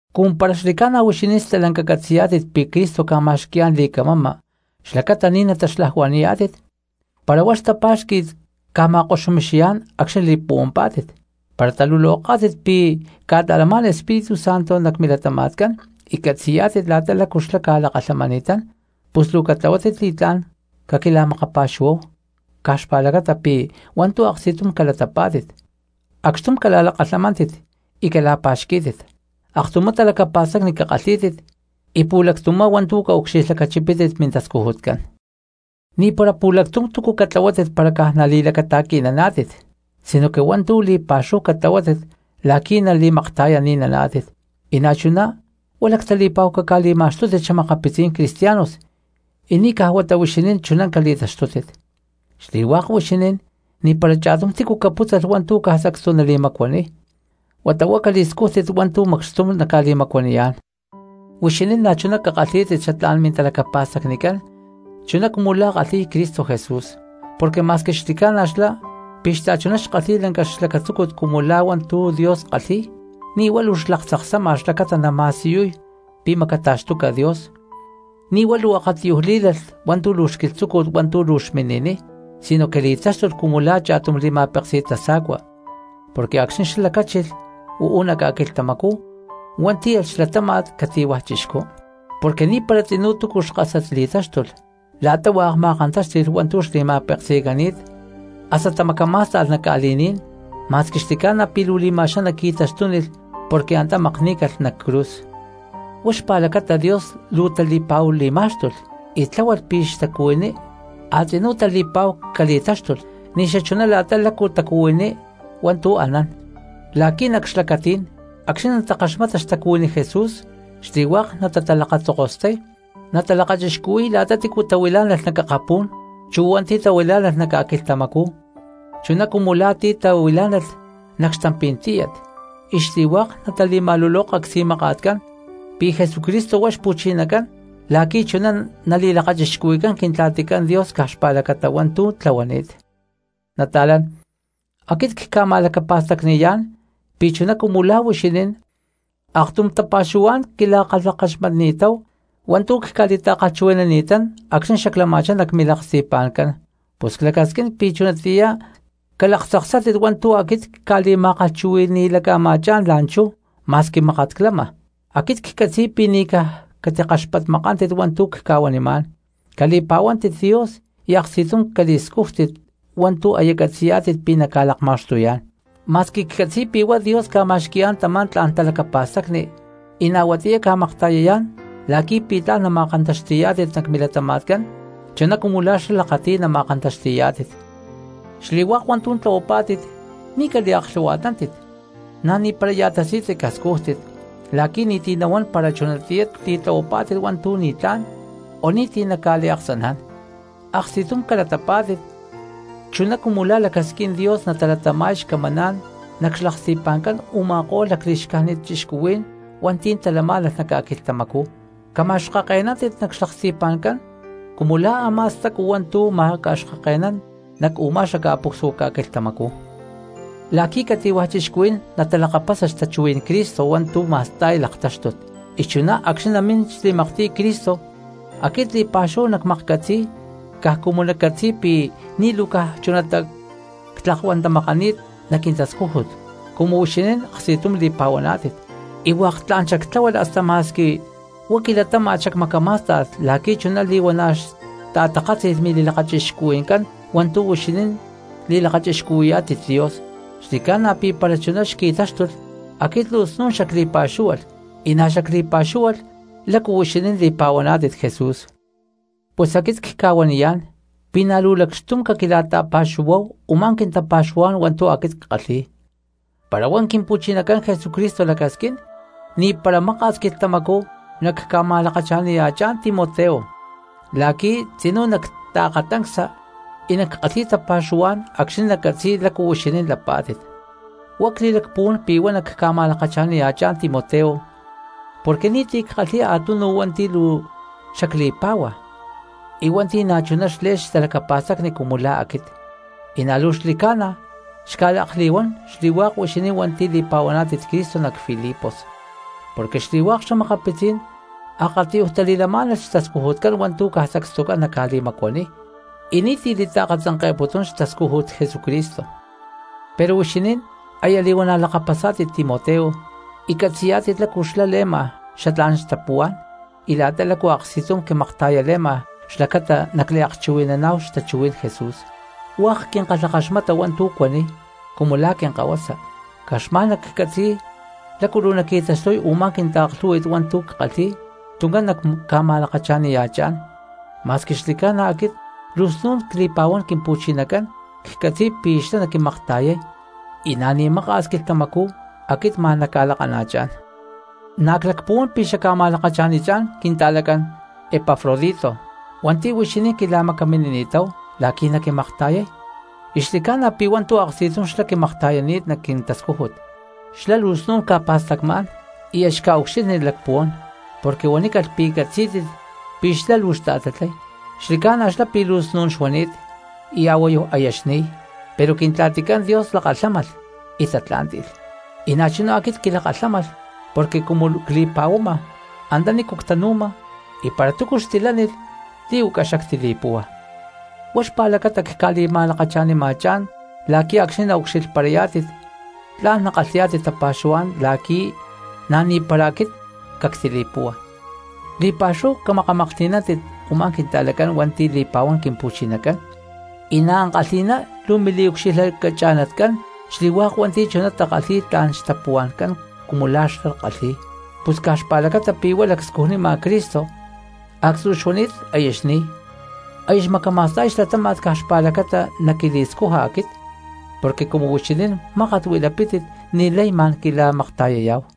Cumu para xli̠ca̠na huixinín stalanca catzi̠yá̠tit pi̠ Cristo ca̠ma̠xqui̠yá̠n li̠camama xlacata ni̠ nataxlajuani̠yá̠tit, para huá xtapá̠xqui̠t ca̠ma̠koxumixiyá̠n acxni̠ li̠puhuampá̠tit, para taluloká̠tit pi̠ ca̠ta̠lamá̠n Espíritu Santo nac milatama̠tcán y catzi̠yá̠tit la̠ta lácu xlá ca̠lakalhamani̠tán, pus luu catlahuátit li̠tlá̠n caquila̠makapa̠xuhuáhu caj xpa̠lacata pi̠ hua̠ntu̠ aksti̠tum calatapá̠tit, acxtum cala̠lakalhamántit y cala̠pa̠xquí̠tit, aktumá talacapa̠stacni cakalhí̠tit y pu̠lactumá hua̠ntu̠ caucxilhlacachipítit mintascujutcán. Ni̠para pu̠lactum túcu catlahuátit para caj nali̠lacata̠qui̠naná̠tit, sinoque hua̠ntu̠ li̠pa̠xúhu catlahuátit la̠qui̠ nali̠makta̠yani̠naná̠tit; y na̠chuná huá lactali̠pa̠hu caca̠li̠ma̠xtútit xa̠makapitzí̠n cristianos y ni̠ caj huata huixinín chuná cali̠taxtútit. Xli̠hua̠k huixinín ni̠para cha̠tum tícu capútzalh hua̠ntu̠ caj sacstu nali̠macuaniy, huata huá cali̠scújtit hua̠ntu̠ macxtum naca̠li̠macuaniyá̠n. Huixinín na̠chuná cakalhí̠tit xatlá̠n mintapuhua̠ncán chuná cumu la̠ kalhi̠y Cristo Jesús, porque: Ma̠squi xli̠ca̠na xlá pi̠ xta̠chuná xkalhi̠y lanca xlacatzúcut cumu la̠ hua̠ntu̠ Dios kalhi̠y, ni̠ huá luu xlaktzaksáma xlacata nama̠siyuy pi̠ macata̠xtuca Dios, ni̠ huá luu akatiyuj lí̠lalh hua̠ntu̠ luu xquilhtzúcut hua̠ntu̠ luu xmini̠niy, sinoque li̠táxtulh cumu la̠ cha̠tum li̠ma̠péksi̠t tasa̠cua, porque acxni̠ lacáchilh uú nac ca̠quilhtamacú huá tíyalh xlatáma̠t cati̠hua̠ chixcú. Porque ni̠para tzinú túcu xkásat li̠táxtulh la̠ta hua̠k ma̠kantáxti̠lh hua̠ntu̠ xli̠ma̠peksi̠cani̠t hasta tamacamá̠sta̠lh nac ca̠li̠ní̠n, ma̠squi xli̠ca̠na pi̠ luu li̠ma̠xaná qui̠taxtúnilh porque antá makní̠calh nac cruz. Huá xpa̠lacata Dios luu tali̠pa̠hu li̠má̠xtulh y tláhualh pi̠ xtacuhuiní a̠tzinú tali̠pa̠hu cali̠táxtulh ni̠xachuná la̠ta lácu tacuhuiní hua̠ntu̠ anán, la̠qui̠ nac xlacatí̠n acxni̠ natakaxmata xtacuhuiní Jesús, xli̠hua̠k natatalakatzokostay natalakachixcuhui̠y la̠ta tícu tahuilá̠nalh nac akapú̠n, chu hua̠nti̠ tahuilá̠nalh nac ca̠quilhtamacú, chuná cumu la̠ ti̠ tahuilá̠nalh nac xtampí̠n tíyat; y xli̠hua̠k natali̠ma̠luloka csi̠maka̠tcán pi̠ Jesucristo huá Xpu̠chinacán, la̠qui̠ chuná nali̠lakachixcuhui̠cán Quintla̠ticán Dios caj xpa̠lacata hua̠ntu̠ tlahuani̠t. Nata̠lán, aquit cca̠ma̠lacapa̠stacni̠yá̠n pi̠ chuná cumu lá huixinín aktum tapa̠xuhuá̠n quila̠kalhakaxmatni̠táhu hua̠ntu̠ cca̠li̠ta̠kalhchuhui̠nani̠tán acxni̠ xaclama̠chá nac milaksti̠pa̠ncán, pus clacasquín pi̠ chunatiyá calaktzaksátit hua̠ntu̠ aquit cca̠li̠ma̠kalhchuhui̠ni̠laca̠ma̠chá̠n la̠nchú ma̠squi mákat clama. Aquit ccatzi̠y pi̠ ni̠ caj catikaxpatmakántit hua̠ntu̠ cca̠huanimá̠n, cali̠pa̠huántit Dios y aksti̠tum cali̠scújtit hua̠ntu̠ aya catzi̠yá̠tit pi̠ naca̠lakma̠xtuyá̠n, ma̠squi catzi̠yá̠tit pi̠ huá Dios ca̠ma̠xqui̠yá̠n tamá tla̠n talacapa̠stacni y na̠ huatiyá ca̠makta̠yayá̠n la̠qui̠ pi̠ tla̠n nama̠kantaxti̠yá̠tit nac milatama̠tcán chuná cumu la̠ xlá lakati̠y nama̠kantaxti̠yá̠tit. Xli̠hua̠k hua̠ntu̠ tlahuapá̠tit ni̠ caliaklhu̠hua̠tnántit na̠ ni̠para ya̠ tasi̠tzi cascújtit, la̠qui̠ ni̠ti̠ nahuán para chunatiyá titlahuapá̠tit hua̠ntu̠ ni̠tlá̠n o ni̠ti̠ naca̠liaksaná̠n. Aksti̠tum calatapá̠tit chuná cumu la̠ lacasquín Dios natalatama̠y xcamaná̠n nac xlaksti̠pa̠ncán u̠ma̠ko̠lh lacli̠xcájnit cristianos hua̠nti̠ talamá̠nalh nac ca̠quilhtamacú. Camacaxkake̠nántit nac xlaksti̠pa̠ncán cumu lá a̠má stacu hua̠ntu̠ macaxkake̠nán nac u̠má xaca̠pucsua ca̠quilhtamacú, la̠qui̠ cati̠hua̠ cristianos natalakapasa xtachuhuí̠n Cristo hua̠ntu̠ ma̠sta̠y laktáxtut. Y chuná acxni̠ namín xli̠maktiy Cristo aquit li̠pa̠xúhu nacmaklhcatzi̠y caj cumu naccatzi̠y pi̠ ni̠ luu caj chunatá ctlakuantamakani̠t nac quintascújut cumu huixinín aksti̠tum li̠pa̠huaná̠tit. Y hua̠k tla̠n xactláhualh hasta ma̠squi huá quilatáma̠t xacmacamá̠sta̠lh la̠qui̠ chuná li̠huana̠ xta̠takátzi̠lh mili̠lakachixcuhui̠ncán hua̠ntu̠ huixinín li̠lakachixcuhui̠yá̠tit Dios. Xli̠ca̠na pi̠ para chuná xqui̠táxtulh aquit luu snu̠n xacli̠pa̠xúhualh, y na̠ xacli̠pa̠xúhualh lácu huixinín li̠pa̠huaná̠tit Jesús. Pus aquit cca̠huaniyá̠n pi̠ na̠ lacxtum caquila̠li̠ta̠pa̠xuhuáhu u̠má quintapa̠xuhuá̠n hua̠ntu̠ aquit ckalhi̠y. Para huá Quimpu̠chinacán Jesucristo lacasquín ni̠para maka̠s quilhtamacú nacca̠ma̠lakacha̠niya̠chá̠n Timoteo la̠qui̠ tzinú nactaakatancsa y nackalhi̠y tapa̠xuhuá̠n acxni̠ naccatzi̠y lácu huixinín lapá̠tit. Huá cli̠lacpuhuán pi̠ huá nacca̠ma̠lakacha̠niya̠chán Timoteo porque ni̠ti̠ ckalhi̠y a̠tunu hua̠nti̠ luu xacli̠pá̠hua y hua̠nti̠ na̠ chuná xle̠lh xtalacapa̠stacni cumu la̠ aquit y na̠ luu xli̠ca̠na xca̠liakatiyún xli̠hua̠k huixinín hua̠nti̠ li̠pa̠huaná̠tit Cristo nac Filipos. Porque xli̠hua̠k xa̠makapitzí̠n akatiyuj tali̠lamá̠nalh xtascujutcán hua̠ntu̠ caj sacstucán naca̠li̠macuaniy y ni̠ti̠ li̠taakatzanke̠putún xtascújut Jesucristo. Pero huixinín aya li̠huana̠ lakapasá̠tit Timoteo y catzi̠yá̠tit lácu xlá le̠ma xatlá̠n xtapuhuá̠n y la̠ta lácu aksti̠tum quimakta̠yale̠ma xlacata nacliakchuhui̠naná̠hu xtachuhuí̠n Jesús, hua̠k quinkalhakaxmata hua̠ntu̠ cuaniy cumu lá quinkahuasa. Caj xma̠n naccatzi̠y lácu luu naqui̠taxtuy u̠má quintaaklhú̠hui̠t hua̠ntu̠ ckalhi̠y tuncán nacca̠ma̠lakacha̠niya̠chá̠n; ma̠squi xli̠ca̠na aquit luu snu̠n cli̠pa̠huán Quimpu̠chinacán ccatzi̠y pi̠ xlá naquimakta̠yay y na̠ ni̠ maka̠s quilhtamacú aquit ma̠n nacca̠lakana̠chá̠n. Na̠ clacpuhuán pi̠ xacca̠ma̠lakacha̠nichá̠n quinta̠lacán Epafrodito hua̠nti̠ huixinín quila̠macaminini̠táhu la̠qui̠ naquimakta̠yay, y xli̠ca̠na pi̠ hua̠ntu̠ aksti̠tum xlá quimakta̠yani̠t nac quintascújut. Xlá luu snu̠n ca̠pa̠stacmá̠n y aya xca̠ucxilhni lacpuhuán, porque huanícalh pi̠ catzí̠tit pi̠ xlá luu xta̠tatlay. Xli̠ca̠na xlá pi̠ luu snún xuani̠t y a̠huayu aya xni̠y, pero Quintla̠ticán Dios lakalhámalh y tatlá̠nti̠lh, y na̠chuná aquit quilakalhámalh porque cumu cli̠puhuama antanícu ctanu̠ma y para túcu xtilánilh li̠huaca xactili̠púhua. Huá xpa̠lacata cca̠li̠ma̠lakacha̠nima̠chá̠n la̠qui̠ acxni̠ naucxilhparayá̠tit tla̠n nakalhi̠yá̠tit tapa̠xuhuá̠n la̠qui̠ na̠ ni̠para aquit cactili̠púhua. Li̠pa̠xúhu camakamaklhti̠nántit u̠má quinta̠lacán hua̠nti̠ li̠pa̠huán Quimpu̠chinacán, y na̠ ankalhi̠na luu mili̠ucxilhlacacha̠natcán xli̠hua̠k hua̠nti̠ chuná takalhi̠y tla̠n xtapuhua̠ncán cumu la̠ xlá kalhi̠y. Pus caj xpa̠lacata pi̠ huá lacscujnima Cristo actzú xuani̠t aya xni̠y, aya xmacama̠sta̠y xlatáma̠t caj xpa̠lacata naquili̠scuja aquit, porque cumu huixinín mákat huilapítit ni̠lay ma̠n quila̠makta̠yayá̠hu.